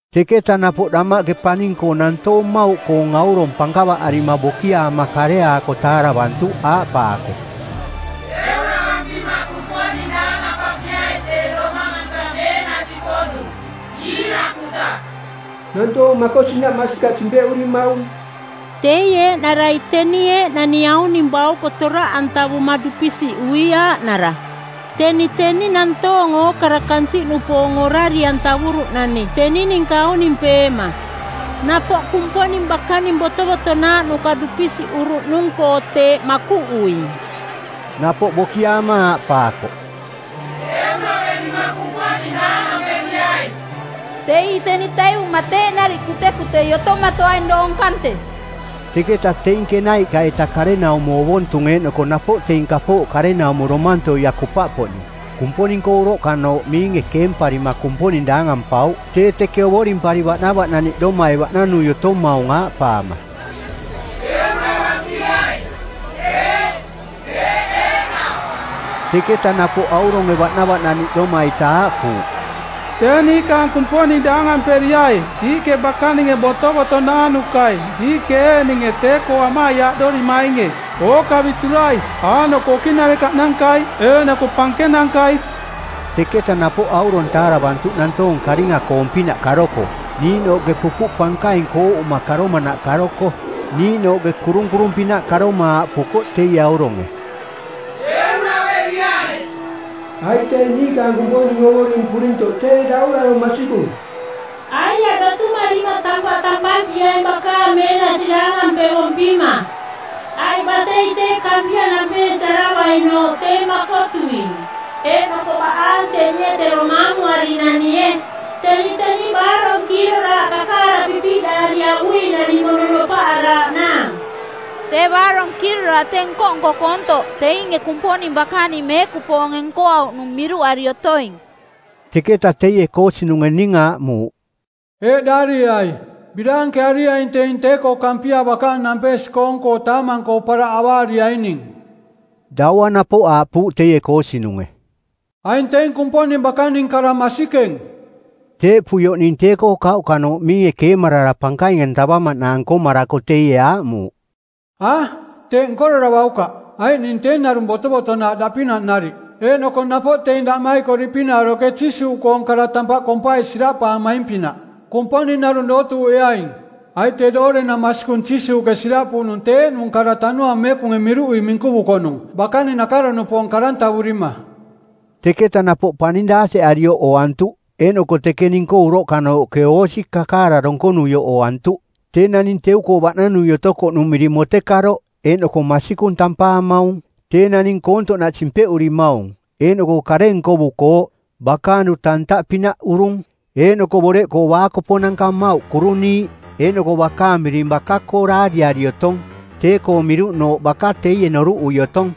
Teketa napoꞌ damaꞌke paning-koo nantoong mmauꞌkoong aurong pankavaꞌarima bokiaama kareaako taaravantuꞌ aaꞌpaako, “Euravampima Kumponing daangampampiai tee Domang-anta meenasi-poꞌnung, iirakuta. Nantoong makosinaꞌ masikaꞌ simpeꞌurimaung. Teie eeꞌnarai teni eeꞌnani auning bauko toraꞌantavuma dupisiꞌui aaꞌnara. Teni teni nantoong ookara kansiꞌnupoong orari-antavuruꞌnani teni ninka aunimpeema. Napoꞌ Kumponing bakaning botovotonaaꞌnuka dupisiꞌuruꞌnung-koo teeꞌ makuꞌuing.” Napoꞌ bokiaama aaꞌpaakoꞌ, “Euraverima Kumponing daangamperiai. Tee ii teni taivuma teeꞌ nariꞌ kutekutei otomatoaing doong kante.” Teketa teing kenaiꞌka-ita karenaumo ovontung eeꞌnoko napoꞌ teing kapooꞌ karenaumo domantoia kupaꞌpoꞌning, Kumponing-koo uroꞌkanooꞌ miinge keemparima Kumponing daangampauꞌ tee teke ovorimpari baꞌnavaꞌnaniꞌdomai baꞌnanui otomaung, aaꞌpaama, “Euravampiaing. Eeꞌ, teeꞌ eeꞌnaꞌ.” Teketa napoꞌ auronge baꞌnavaꞌnaniꞌdoma-ita aaꞌpuuꞌ, “Tee niikaang Kumponing daangamperiai, diiꞌke bakaning botovotonaaꞌnukai, diiꞌke eeꞌninge tee-koo amaiaaꞌdorimainge, ookaviturai aaꞌnoko okiꞌnarekaꞌnankai eeꞌnoko pankenankai.” Teketa napoꞌ aurong taaravantuꞌ nantoong karinga-koong-pinaꞌ karoko, niiꞌnooꞌke pupuꞌ pankaing kooꞌuma karomanaꞌ karoko, niiꞌnooꞌke kurunkurung-pinaꞌ karoma aaꞌpukoꞌ teie auronge, “Euraveriai, aiꞌ tee niikaang Kumponing Ovoring purintoꞌ tee Daurarong˜ masikung. Aiaꞌ, dotumarima tampaꞌ tampampiai bakaang meenasi daangampevompima, aiꞌ batei tee Kampia nampeesiaravainooꞌ tee makotuing, eeꞌnoko baꞌaang tenie tero maamuari-nanie. Teni teni baarong kiiroraaꞌ kakaara pipiꞌdaari avui-nani mono nopaꞌaraaꞌnaang.” Tee baarong kiiroraaꞌ tee nko-nko koontoꞌ teinge Kumponing bakaning meekupoonge nkoauꞌnung miruꞌari otoing. Teketa teie koosinunge ning aaꞌmuuꞌ, “Eeꞌ daarieai, ‘Biraankeariaing teing tee-koo Kampia bakaang nampeesi-koong-koo taamang-koo paraꞌ avaariaining.’” Daua napoꞌ aaꞌpuuꞌ teie koosinunge, “Aing teing Kumponing bakaning kara masikeng.” Teeꞌpuioꞌ ning tee-koo kauꞌkanooꞌ miinge keemarara pankaing-antavamaꞌnaang nkomarako teie aaꞌmuuꞌ, “A! Teeꞌ nkoraravaukaꞌ, aiꞌ ning tee narung botovotonaaꞌ daꞌpinaꞌ nariꞌ, eeꞌnoko napoꞌ teing daꞌmaikoriꞌpinaꞌ oroꞌke Jiisuuꞌkoong kara tampaꞌ kompai siraꞌpaamaing-pinaꞌ. Kumponing narung dootuuꞌeaing, aiꞌ tee doorenang masikung Jiisuuꞌke siraꞌpuuꞌnung tee eeꞌnung kara Tanuaang Meekunge miruꞌui minkuvukoꞌnung bakaning nakaro-nupoong˜ karantavurima˜.” Teketa napoꞌ paning daateꞌarioꞌ ooantuꞌ eeꞌnoko teke ning-koo uroꞌkanooꞌke oosi kakaara donkonuioꞌ ooantuꞌ, tee naning teu-koo bananui otokoꞌnung miring Motekaroꞌ eeꞌnoko Masikung tampaamaung. Tee naning koontoꞌnaꞌ simpeꞌurimaung eeꞌnoko kare nkovukooꞌ. Bakaang duta ntaꞌpinaꞌ urung eeꞌnoko boreꞌkoo baakoponanka mmauꞌ kuruniiꞌ. Eeꞌnoko bakaang miring baka-koo daariari otong, tee-koong miruꞌnooꞌ baka teie noruꞌui otong.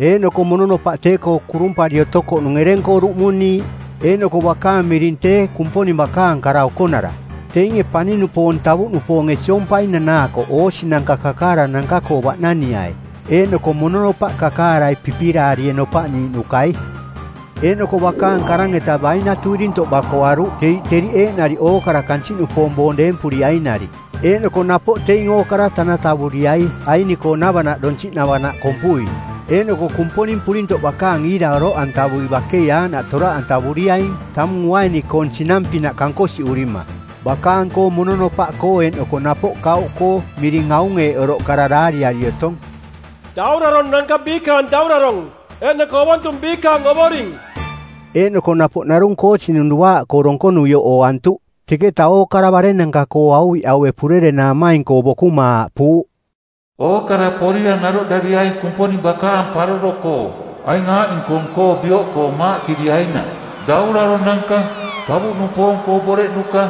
Eeꞌnoko mononopaꞌ tee-koo kurumpari otokoꞌnung ereng-koo duꞌmuniiꞌ, eeꞌnoko bakaang miring “Tee Kumponing Bakaang Kara Okonara.” Teinge paning-nupoong tavuꞌnupoonge siompai nanaakoꞌ oosinanka kakaarananka-koo baꞌnaniai, eeꞌnoko mononopaꞌ kakaarai pipiraarie nopaꞌniiꞌnukai. Eeꞌnoko bakaang karang-eta bainatu irintoꞌ bakoaruꞌ teriꞌ teriꞌ eeꞌnariꞌ ookara kansiꞌnupoong boong deempuriainariꞌ. Eeꞌnoko napoꞌ teing ookara tanatavuriai aini-koonavanaꞌ donsiꞌnavanaꞌ kompui. Eeꞌnoko Kumponing Purintoꞌ bakaang iira oroꞌantavui bakei aaꞌnaꞌ toraꞌantavuriaing tamung uaini-koong sinang-pinaꞌ kankosiꞌurima. Bakaang-koo mononopaꞌkoo eeꞌnoko napoꞌ kauꞌkoo miring aung eeꞌ oroꞌ kara daariari otong, “Dauraronanka Biikaang Daurarong eeꞌnoko Ovontung Biikaang Ovoring.” Eeꞌnoko napoꞌ narung koosinung duaaꞌkoo donkonuioꞌ ooantuꞌ. Teketa ookara barennanka-koo auviꞌaue purerenaamaing-koo bokuma aaꞌpuuꞌ, “Ookara porira naroꞌdariai Kumponing bakaang paroro-koo, aing aaꞌning-koong-koo bioꞌkoo maaꞌkiriainaꞌ: dauraronanka, tavuꞌnupoong-koo boreꞌnuka,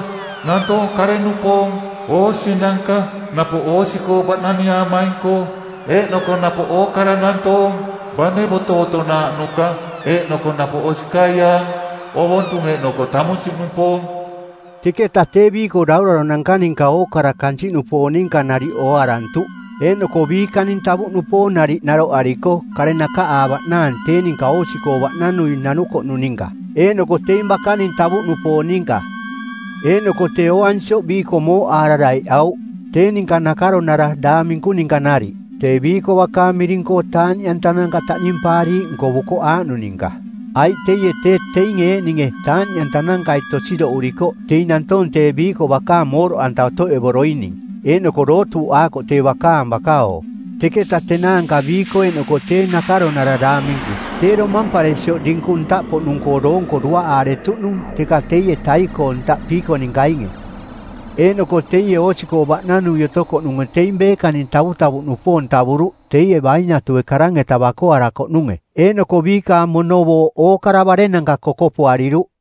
nantoong kare-nupoong, oosinanka, napoꞌ oosi-koo baꞌnaniaamaing-koo, eeꞌnoko napoꞌ ookara nantoong, bane botovotonaaꞌnuka eeꞌnoko napoꞌ osikaiaang, ovontung eeꞌnoko tamunsiꞌnupoong.” Teketa tee tee biiko dauraronanka ninka ookara kansiꞌnupoong ninka nariꞌ ooarantuꞌ eeꞌnoko biikaning tavuꞌnupoong nariꞌ naroꞌariko kare nakaꞌaavaꞌnaang tee ninka oosi-koo baꞌnanui nanukoꞌnung ninka, eeꞌnoko teing bakaning tavuꞌnupoong ninka. Eeꞌnoko tee ooansioꞌ biiko mooꞌaara daiꞌauꞌ, tee ninka nakaronara daang minku ninka nariꞌ, tee biiko bakaang miring-koo taaꞌniꞌantananka taꞌnimpaariiꞌ nkovukoꞌ aaꞌnung ninka. Aiꞌ teie tee teinge eeꞌninge taaꞌniꞌantanankai tosidoꞌurikoꞌ teing nantoong tee biiko bakaang mooꞌdoꞌanta otoꞌevoroining eeꞌnoko dootuuꞌaakoꞌ tee bakaang baka-oo. Teketa tenaanka biiko eeꞌnoko tee nakaronara daangminku tee domamparesioꞌ dinkung ntaꞌpoꞌnung-koo doonko duaꞌaaretuꞌnung teka teie tai-koo ntaꞌ piiko-ninkainge. Eeꞌnoko teie oosi-koo baꞌnanui otokoꞌnunge teing beekaning tavutavuꞌnupoong tavuruꞌ teie bainatue karang-eta bakoarakoꞌnunge. Eeꞌnoko biikaang mono booꞌ ookara barennanka kokopoariruꞌ.